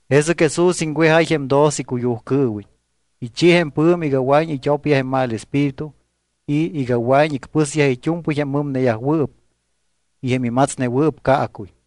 Jesɨc Jesús iŋwejáy jém doce icuyujcɨɨwiñ. Ichi jém pɨ̱mi iga wɨa̱iñ it́opyaj jém mal espíritu y iga wɨa̱iñ icpɨsyaj it́u̱mpɨy jém mɨmneyajwɨɨp y jém imatsnewɨɨp caacuy.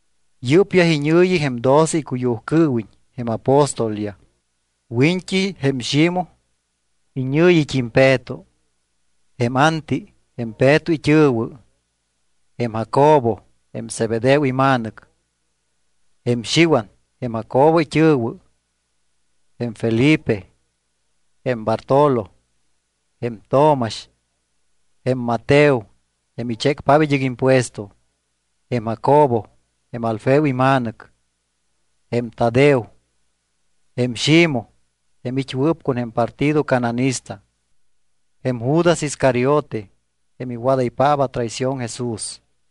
Yɨ́pyaj iñɨ̱yi jém doce icuyujcɨɨwiñ jém apóstolyaj: Wiñt́i jém Ximoj, iñɨ̱yit́im Peto; jém Anti, jém Peto it́ɨ̱wɨ; jém Jacobo, jém Zebedeo ima̱nɨc; jém Xiwan, jém Jacobo it́ɨ̱wɨ; jém Felipe; jém Bartolo; jém Tomax; jém Mateo, jém ichécpaap id́ɨc impuesto; jém Jacobo, jém Alfeo ima̱nɨc; jém Tadeo; jém Ximoj, jém it́wɨɨp con jém partido cananista; jém Judas Iscariote, jém iwadaypaap atraición Jesús.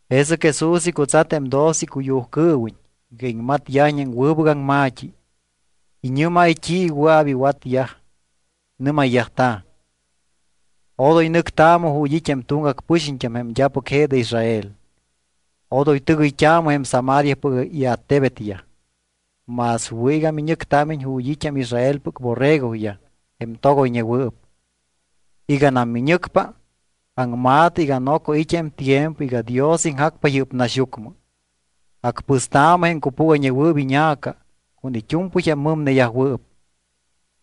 Jesɨc Jesús icutsat jém doce icuyujcɨɨwiñ iga iŋmatyajiñ jém wɨbɨc aŋma̱t́i. Iñɨ́máy t́i wɨa̱p iwatyaj. Nɨ́mayyajta̱: —Odoy nɨctaamɨ ju̱t́ it́ jém tuŋgac pɨxiñt́am jém d́apɨc je de Israel. Odoy tɨgɨyt́aamɨ jém Samariapɨc iattebetyaj. Más wɨ̱ iga miñɨctámiñ ju̱t́ it́ jém Israelpɨc borregoyaj jém togoyñewɨɨp. Iganam miñɨcpa, aŋma̱tɨ iga noco it́ jém tiempo iga Dios iŋjacpa yɨ́p naxyucmɨ. Acpɨstaamɨ jém cupúgayñewɨɨp iña̱ca con it́u̱mpɨy jém mɨmneyajwɨɨp.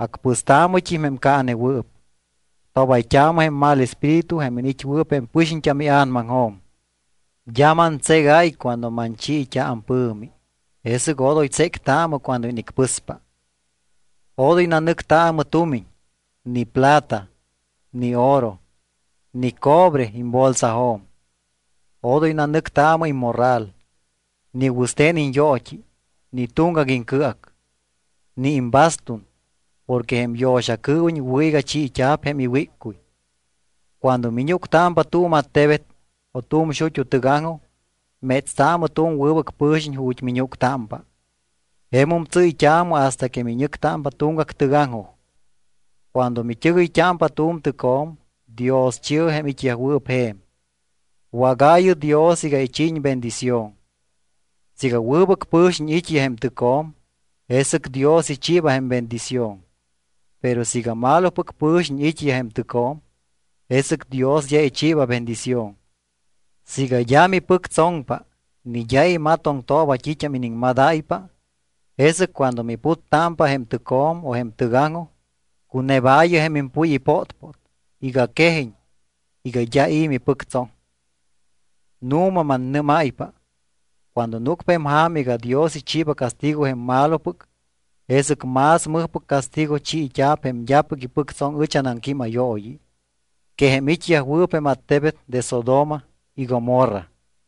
Acpɨstaamɨt́im jém caanewɨɨp. Tobayt́aamɨ jém mal espíritu jém iniit́wɨɨp jém pɨxiñt́am ia̱namaŋjo̱m. D́a mantségáy cuando manchiit́a ampɨ̱mi, jesɨc odoy tséctaamɨ cuando inicpɨspa. ’Odoy nanɨctaamɨ tumiñ; ni plata, ni oro, ni cobre imbolsajo̱m. Odoy nanɨctaamɨ immorral, ni wɨste̱n iñyoot́i, ni tuŋgac iŋcɨac, ni imbastun, porque jém yo̱xacɨɨwiñ wɨ̱ iga chiit́a̱p jém iwíccuy. ’Cuando miñúctámpa tu̱m attebet o tu̱m xut́u tɨgaŋjoj, métstaamɨ tu̱m wɨbɨc pɨ̱xiñ ju̱t́ miñúctámpa. Jemum tsɨ́yt́aamɨ hasta que miñɨctámpa tuŋgac tɨgaŋjoj. Cuando mit́ɨgɨyt́ámpa tu̱m tɨcjo̱m, dioschi̱ɨ jém it́yajwɨɨp je̱m. Wágaayɨ Dios iga ichiiñ bendición. Siiga wɨbɨc pɨ̱xiñ it́yaj jém tɨcjo̱m, jesɨc Dios ichiiba jém bendición. Pero siiga malopɨc pɨ̱xiñ it́yaj jém tɨcjo̱m, jesɨc Dios d́a ichiiba bendición. Siiga d́a mipɨctsoŋpa ni d́a imatoŋtooba t́it́am iniŋmadáypa, jesɨc cuando miputtámpa jém tɨcjo̱m o jém tɨgaŋjoj, cunebaayɨ jém impuy ipótpót iga quejiñ iga d́a i̱ mipɨctsoŋ. Nu̱ma mannɨ́máypa cuando núcpa jém ja̱ma iga Dios ichiiba castigo jém malopɨc, jesɨc más mɨjpɨc castigo chiit́a̱p jém d́apɨc ipɨctsoŋ ɨch anaŋquímayooyi que jém it́yajwɨɨp jém attebet de Sodoma y Gomorra.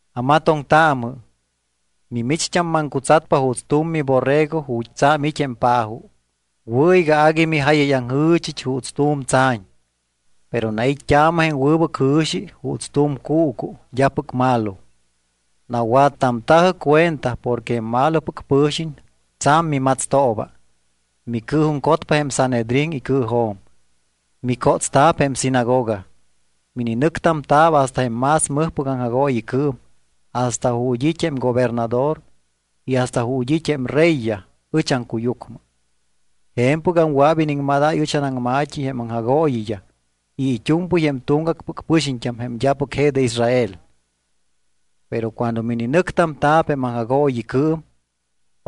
’Amatoŋtaamɨ. Mimicht́am maŋcutsatpa juuts tu̱m miborrego ju̱t́ tsa̱m it́ jém pa̱jo. Wɨ̱ iga agui mijáyayaŋjɨ̱chɨch juuts tu̱m tsa̱ñ. Pero nait́t́aamɨ jém wɨbɨc jɨ̱xi juuts tu̱m cuucu d́apɨc malo. Nawattamta̱jɨ cuenta porque jém malopɨc pɨ̱xiñ tsa̱m mimatstooba, micɨɨjuŋcotpa jém Sanhedrín icɨɨjo̱m. Micótsta̱p jém sinagoga. Mininɨctamta̱p hasta jém más mɨjpɨc aŋjagooyicɨɨm hasta ju̱t́ it́ jém gobernador y hasta ju̱t́ it́ jém reyyaj ɨch aŋcuyucmɨ. Je̱mpɨgam wɨa̱p iniŋmadáy ɨch anaŋma̱t́i jém aŋjagooyiyaj y it́u̱mpɨy jém tuŋgacpɨc pɨxiñt́am jém d́apɨc je de Israel. Pero cuando mininɨctamta̱p jém aŋjagooyicɨɨm,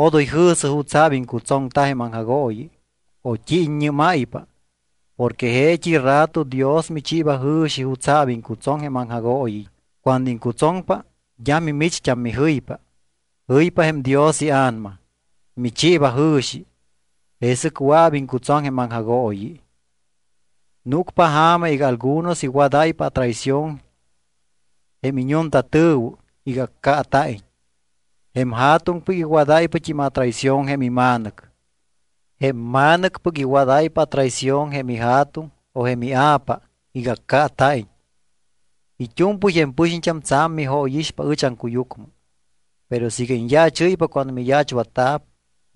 odoy jɨ̱sɨ jutsa̱p iŋcutsoŋta jém aŋjagooyi o t́i iññɨ́máypa porque jeet́i rato Dios michiiba jɨ̱xi jutsa̱p iŋcutsoŋ jém aŋjagooyi. Cuando iŋcutsoŋpa d́a mimicht́am mijɨypa. Jɨypa jém Dios iA̱nama, michiiba jɨ̱xi, jesɨc wɨa̱p iŋcutsoŋ jém aŋjagooyi. ’Núcpa ja̱ma iga algunos iwadáypa atraición jém iñuntatɨ̱wɨ iga accaata̱iñ. Jém ja̱tuŋpɨc iwadáypat́im atraición jém ima̱nɨc. Jém ma̱nɨcpɨc iwadáypa atraición jém ija̱tuŋ o jém ia̱pa iga accaata̱iñ. It́u̱mpɨy jém pɨxiñt́am tsa̱m mijóyixpa ɨch aŋcuyucmɨ. Pero siiga iñyaachɨ́ypa cuando miyaachwatta̱p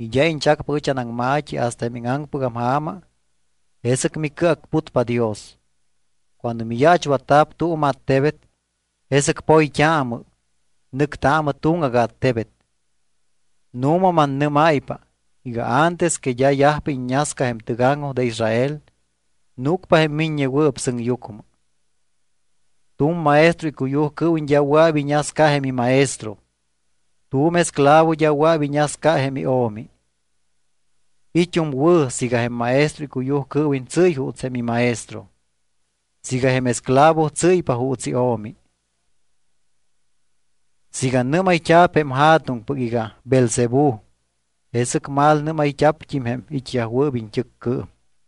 y d́a iñchacpa ɨch anaŋma̱t́i hasta jém íŋaŋpɨgam ja̱ma, jesɨc micɨacputpa Dios. Cuando miyaachwatta̱p tu̱m attebet, jesɨc poyt́aamɨ, nɨctaamɨ tuŋgac attebet. Nu̱ma mannɨ́máypa iga antes que d́a yajpa iññasca jém tɨgaŋjoj de Israel, núcpa jém Miññewɨɨp Sɨŋyucmɨ. ’Tu̱m maestro icuyujcɨɨwiñ d́a wɨa̱p iñasca jém imaestro. Tu̱m esclavo d́a wɨa̱p iñasca jém io̱mi. It́um wɨ̱ siiga jém maestro icuyujcɨɨwiñ tsɨ́y juuts jém imaestro, siiga jém esclavo tsɨ́ypa juuts io̱mi. Siiga nɨ́mayt́a̱p jém ja̱tuŋpɨc iga Beelzebú, jesɨc malnɨ́mayt́a̱pt́im jém it́yajwɨɨp it́ɨccɨɨm.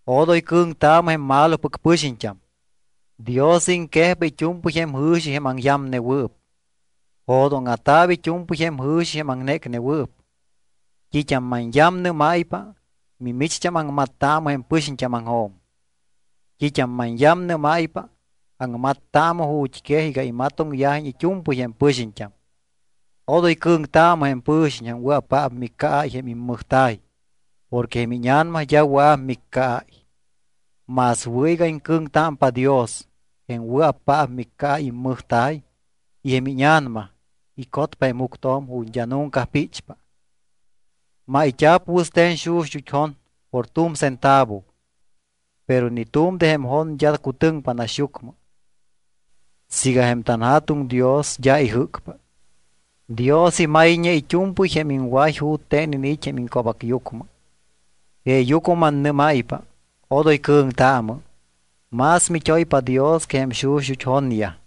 ’Odoy cɨ̱ŋtaamɨ jém malopɨc pɨxiñt́am. Dios iŋquejpa it́u̱mpɨy jém jɨ̱xi jém aŋyamnewɨɨp. Jo̱dóŋa̱ta̱p it́u̱mpɨy jém jɨ̱xi jém aŋnécnewɨɨp. T́it́am manyamnɨ́máypa, mimicht́am aŋmattaamɨ jém pɨxiñt́ámaŋjo̱m. T́it́am manyamnɨ́máypa, aŋmattaamɨ ju̱t́quej iga imatoŋyajiñ it́u̱mpɨy jém pɨxiñt́am. Odoy cɨ̱ŋtaamɨ jém pɨ̱xiñ jém wɨa̱paap miccaáy jém immɨjta̱y porque jém íña̱nama d́a wɨa̱p miccaáy. Más wɨ̱ iga iŋcɨ̱ŋtámpa Dios jém wɨa̱paap miccaáy immɨjta̱y y jém íña̱nama icotpa jém juctjo̱m ju̱t́ d́a nunca píchpa. ’Mayt́a̱p wɨste̱n xuxut́ jon por tu̱m centavo, pero ni tu̱m de jém jonyaj d́a cutɨŋpa naxyucmɨ siiga jém tanJa̱tuŋ Dios d́a ijɨ́cpa. Dios imayñe it́u̱mpɨy jém iŋway jute̱n iniit́ jém iŋco̱bacyucmɨ. Jeeyucmɨ mannɨ́máypa, odoy cɨ̱ŋtaamɨ. Más mit́oypa Dios que jém xuxut́ jonyaj.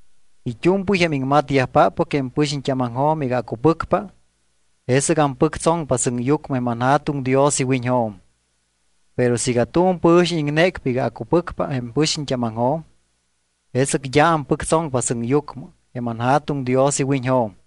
’It́u̱mpɨy jém iŋmatyajpáppɨc jém pɨxiñt́ámaŋjo̱m iga acupɨcpa, jesɨc ampɨctsoŋpa sɨŋyucmɨ jém anJa̱tuŋ Dios iwiñjo̱m. Pero siiga tu̱m pɨ̱xiñ iŋnécpa iga acupɨcpa jém pɨxiñt́ámaŋjo̱m, jesɨc d́a ampɨctsoŋpa sɨŋyucmɨ jém anJa̱tuŋ Dios iwiñjo̱m.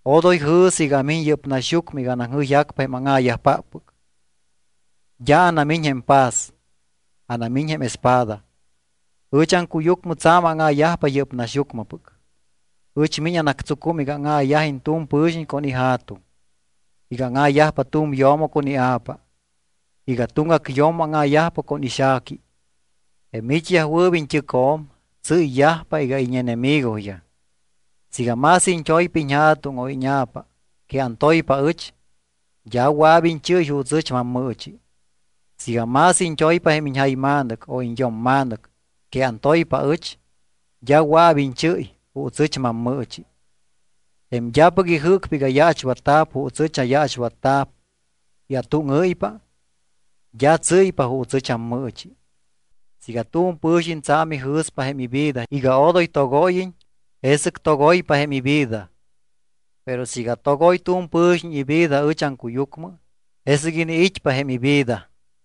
’Odoy jɨ̱sɨ iga amiñ yɨ́p naxyucmɨ iga anaŋjɨyjacpa jém áŋa̱yajpáppɨc. D́a anamiñ jém paz, anamiñ jém espada. Ɨch aŋcuyucmɨ tsa̱m áŋa̱yajpa yɨ́p naxyucmɨpɨc. Ɨch miñ anactsucum iga áŋa̱yajiñ tu̱m pɨ̱xiñ con ija̱tuŋ, iga áŋa̱yajpa tu̱m yo̱mo con ia̱pa, iga tuŋgac yo̱mo áŋa̱yajpa con ixa̱qui. Jém it́yajwɨɨp iñt́ɨcjo̱m tsɨ́yyajpa iga íñenemigoyaj. ’Siiga más iñt́oypa iñja̱tuŋ o íña̱pa que antoypa aɨch, d́a wɨa̱p iñchɨ́y juuts ɨch mammɨɨchi. Siiga más iñt́oypa jém iñjayma̱nɨc o iñyo̱mma̱nɨc que antoypa aɨch, d́a wɨa̱p iñchɨ́y juuts ɨch mammɨɨchi. Jém d́apɨc ijɨ́cpa iga yaachwatta̱p juuts ɨch ayaachwatta̱p y atúŋɨ́ypa, d́a tsɨ́ypa juuts ɨch ammɨɨchi. Siiga tu̱m pɨ̱xiñ tsa̱m ijɨ̱spa jém ivida iga odoy togóyiñ, jesɨc togoypa jém ivida. Pero siiga togoy tu̱m pɨ̱xiñ ivida ɨch aŋcuyucmɨ, jesɨc iniit́pa jém ivida.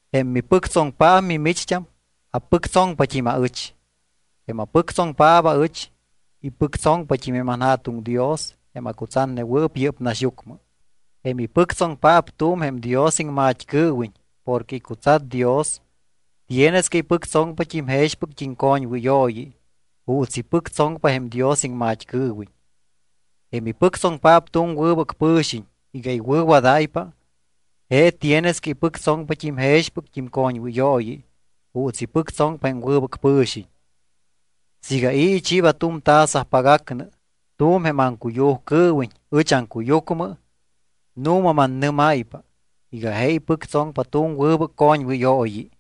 ’Jém mipɨctsoŋpaap mimicht́am, apɨctsoŋpat́im aɨch. Jém apɨctsoŋpaap aɨch, ipɨctsoŋpat́im jém anJa̱tuŋ Dios jém acutsatnewɨɨp yɨ́p naxyucmɨ. Jém ipɨctsoŋpaap tu̱m jém Dios iŋmat́cɨɨwiñ porque icutsat Dios tienes que ipɨctsoŋpat́im jexpɨct́im coñwɨyooyi juuts ipɨctsoŋpa jém Dios iŋmat́cɨɨwiñ. Jém ipɨctsoŋpaap tu̱m wɨbɨc pɨ̱xiñ iga iwɨ̱wadáypa, je tienes que ipɨctsoŋpat́im jexpɨct́im coñwɨyooyi juuts ipɨctsoŋpa jém wɨbɨc pɨ̱xiñ. Siiga i̱ ichiiba tu̱m taza pagac nɨ tu̱m jém aŋcuyujcɨɨwiñ ɨch aŋcuyucmɨ, nu̱ma mannɨ́máypa iga je ipɨctsoŋpa tu̱m wɨbɨc coñwɨyooyi.